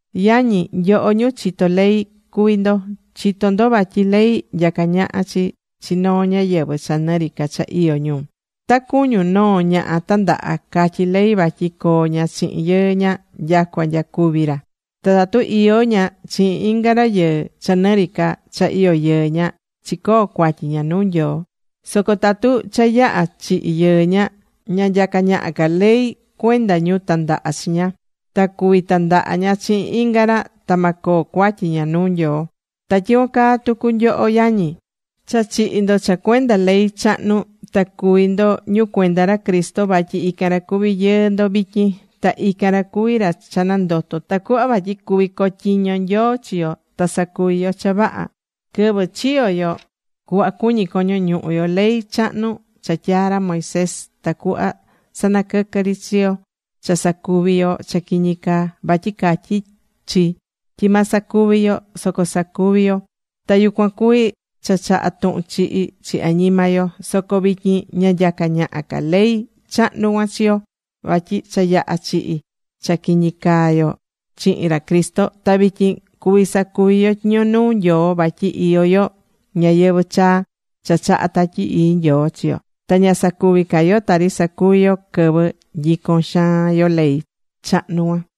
Yañi, nyoho ñu chitó ley cuví ndo, chitó ndo vatyi ley nyacá ñaha chi chi noo ñáyɨvɨ cha nɨ ri ca cha iyó ñu. Ta cuñun, noo ñaha tandaha, catyí ley vatyi coo ña chihin yɨɨ ña nyacua nya cúvi ra. Ta tatu iyó ña chihin inga rayɨɨ cha nɨ ri cha iyó yɨɨ ña, chicoo̱ cuatyi ña nuu Nyoo. Soco tatu cha yaha̱ chihi yɨɨ ña, ña nyacá ñaha ca ley cuenda ñu tandaha chi ña, ta cuví tandaha ña chihin inga ra, ta ma coo cuatyi ña nuu Nyoo. Ta tyicuan caa tucu nyoho yañi. Cha chihi̱ ndo cha cuenda ley chahnu ta cuví ndo ñu cuenda ra Cristo vatyi ican ra cuví yɨɨ ndo vityin. Ta ican ra cuví ra cha nandoto̱, tacuhva vatyi cuví cotyiño Nyoo chi yo ta sacuvi yo cha vaha. Quɨvɨ chiyo̱ yo cuhva cuñí coño ñuhu yo, ley chahnu cha tyaa̱ ra Moisés, tacuhva sanaquɨquɨ̱ ri chi chi yo cha sacuvi yo cha quiñi caa, vatyi catyí chi tyi ma sacuvi yo. Soco sacuvi̱ yo, ta yucuan cuví cha chaha̱ tuhun chihi chi añima yo. Soco vityin ña nyacá ñaha ca ley chahnu cuan chi yo, vatyi cha yaha̱ chihi cha quiñi caa yo chihin ra Cristo. Ta vityin cuví sacuvi yo tyiño nuu Nyoo vatyi iyó yo ñayɨvɨ̱ chaa cha chahá Tatyi Ii Nyoo chi yo, ta ña sacuví ca yo tari sacuvi̱ yo quɨvɨ nyico̱n xaan yo ley chahnu cuan.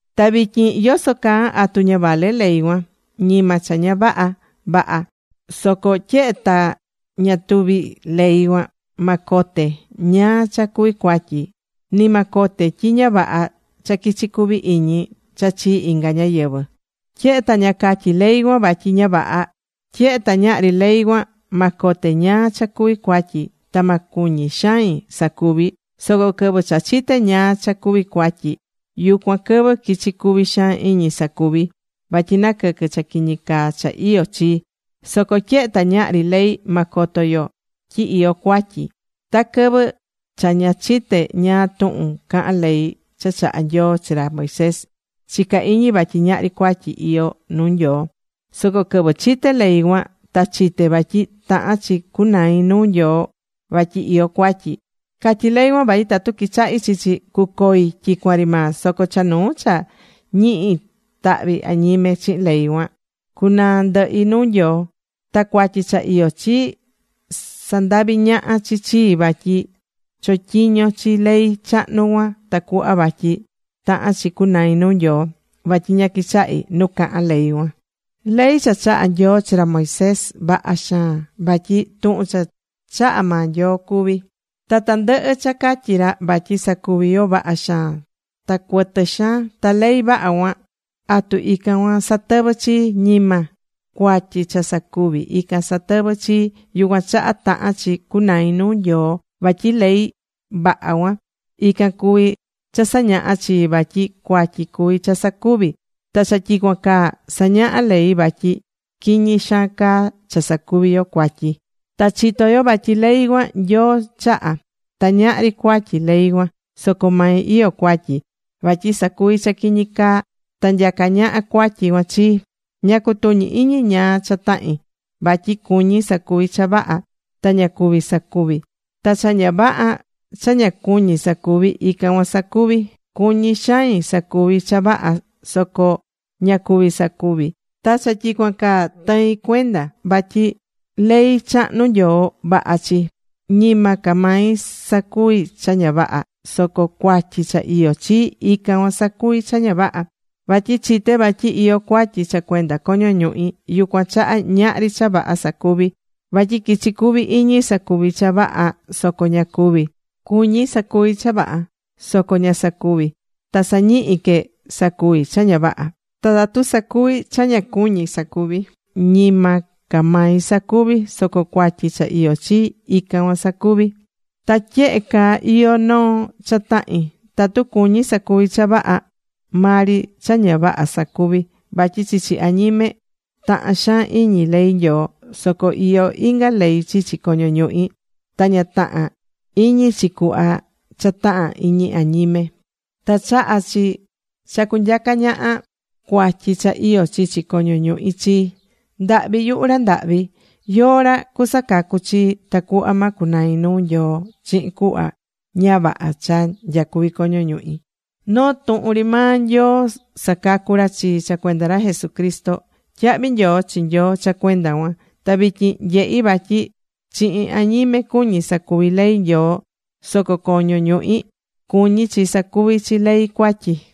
Ta vityin yoso caa, ¿atu ña vaha ley cuan? Ñima cha ña vaha. Vaha. Soco tyehe ta ña tuvi̱ ley cuan, ma cote ñáá cha cuví cuatyi. Ni ma cote tyi ña vaha cha quichi cuvi iñi cha chii inga ñáyɨvɨ, tyehe ta ña catyí ley cuan vatyi ña vaha. Tyehe ta ñahri ley cuan, ma cote ñáá cha cuví cuatyi, ta ma cuñi xain sacuvi, soco quɨvɨ cha chité ñáá cha cuví cuatyi, yucuan quɨvɨ quichi̱ cuvi xaan iñi sacuvi, vatyi naquɨquɨ̱ cha quiñi caa cha iyó chi. Soco tyehe ta ñahri ley, ma coto yo tyi iyó cuatyi. Ta quɨvɨ cha ña chite̱ ñáá tuhun cahán ley cha chaha̱ Nyoo chi ra Moisés, chica̱ iñi vatyi ñahri cuatyi iyó nuu Nyoo. Soco quɨvɨ chite̱ ley cuan, ta chite̱ vatyi tahán chi cunai nuu Nyoo vatyi iyó cuatyi. Catyí ley cuan tyi tatu quichahí chi chi, cucoi tyicuan ri maa. Soco cha nuu cha ñihi tahvi añime chihin ley cuan, cunaa ndɨhi nuu Nyoo. Ta cuatyi cha iyó chii, sandavi̱ ñaha chi chii vatyi chotyiño̱ chi ley chahnu cuan tacuhva vatyi taha̱n chi cunai nuu Nyoo, vatyi ña quichahi̱ nu cahán ley cuan. Ley cha chaha̱ Nyoo chi ra Moisés, vaha xaan, vatyi tuhun cha chaha̱ maa Nyoo cuví, ta tandɨhɨ cha catyí ra vatyi sa̱cuvi yo, vaha xaan ta cuɨtɨ xaan. Ta ley vaha cuan, ¿atu ican cuan satɨvɨ̱ chii? Ñima. Cuatyi cha sacuvi̱, ican satɨvɨ̱ chii, yucuan chaha tahán chi cunai nuu Nyoo. Vatyi ley vaha cuan, ican cuví cha sañahá chii vatyi cuatyi cuví cha sacuvi̱. Ta cha tyicuan caa, sañahá ley vatyi quiñi xaan caa cha sacuví yo cuatyi. Ta chitó yo vatyi ley cuan, Nyoo chaha̱. Ta ñahri cuatyi ley cuan. Soco mai iyó cuatyi vatyi sacuví cha quiñi caa ta nyacá ñaha cuatyi cuan chii. Ña cutuñí iñi ñáá cha tahin. Vatyi cuñí sacuvi cha vaha, ta ña cuví sacuvi. Ta cha ña vaha cha ña cuñí sacuvi, ican cuan sacuví. Cuñí xain sacuvi cha vaha, soco ña cuví sacuvi, ta cha tyicuan caa tɨin cuenda vatyi ley chahnu Nyoo, vaha chi. Ñima ca mai sacuví cha ña vaha, soco cuatyi cha iyó chii, ican cuan sacuví cha ña vaha. Vatyi chité vatyi iyó cuatyi cha cuenda coño ñuhi. Yucuan chaha ñahri cha vaha sacuví, vatyi quichí cuvi iñi sacuvi cha vaha, soco ña cuví. Cuñí sacuvi cha vaha, soco ña sacuví ta sañihí que sacuvi cha ña vaha. Ta tatu sacuví cha ña cuñí sacuvi, ñima ca mai sacuví, soco cuatyi cha iyó chii, ican cuan sacuví. Ta tyehe caa iyó noo cha tahin, tatu cuñí sacuvi cha vaha, maa ri cha ña vaha sacuví. Vatyi chichi añime tahán xaan iñi ley Nyoo. Soco iyó inga ley chichi coño ñuhi, ta ña tahán iñi chi cuhva cha tahán iñi añime. Ta chahá chi cha cunyaca ñaha cuatyi cha iyó chichi coño ñuhi chii. ¡Ndahvi yuhu ra ndahvi! ¿Yóó ra cusacacu chii tacuhva ma cunai nuu Nyoo chihin cuhva ña vaha cha nyacuví coño ñuhi? Noo tuhun ri maa Nyoo sacacú ra chii cha cuenda ra Jesucristo. ¡Tyahvi nyoo chi Nyoo cha cuenda cuan! Ta vityin nyehí vatyi chihin añime cuñí sacuví ley Nyoo, soco coño ñuhi cuñí chi sacuví chi ley cuatyi.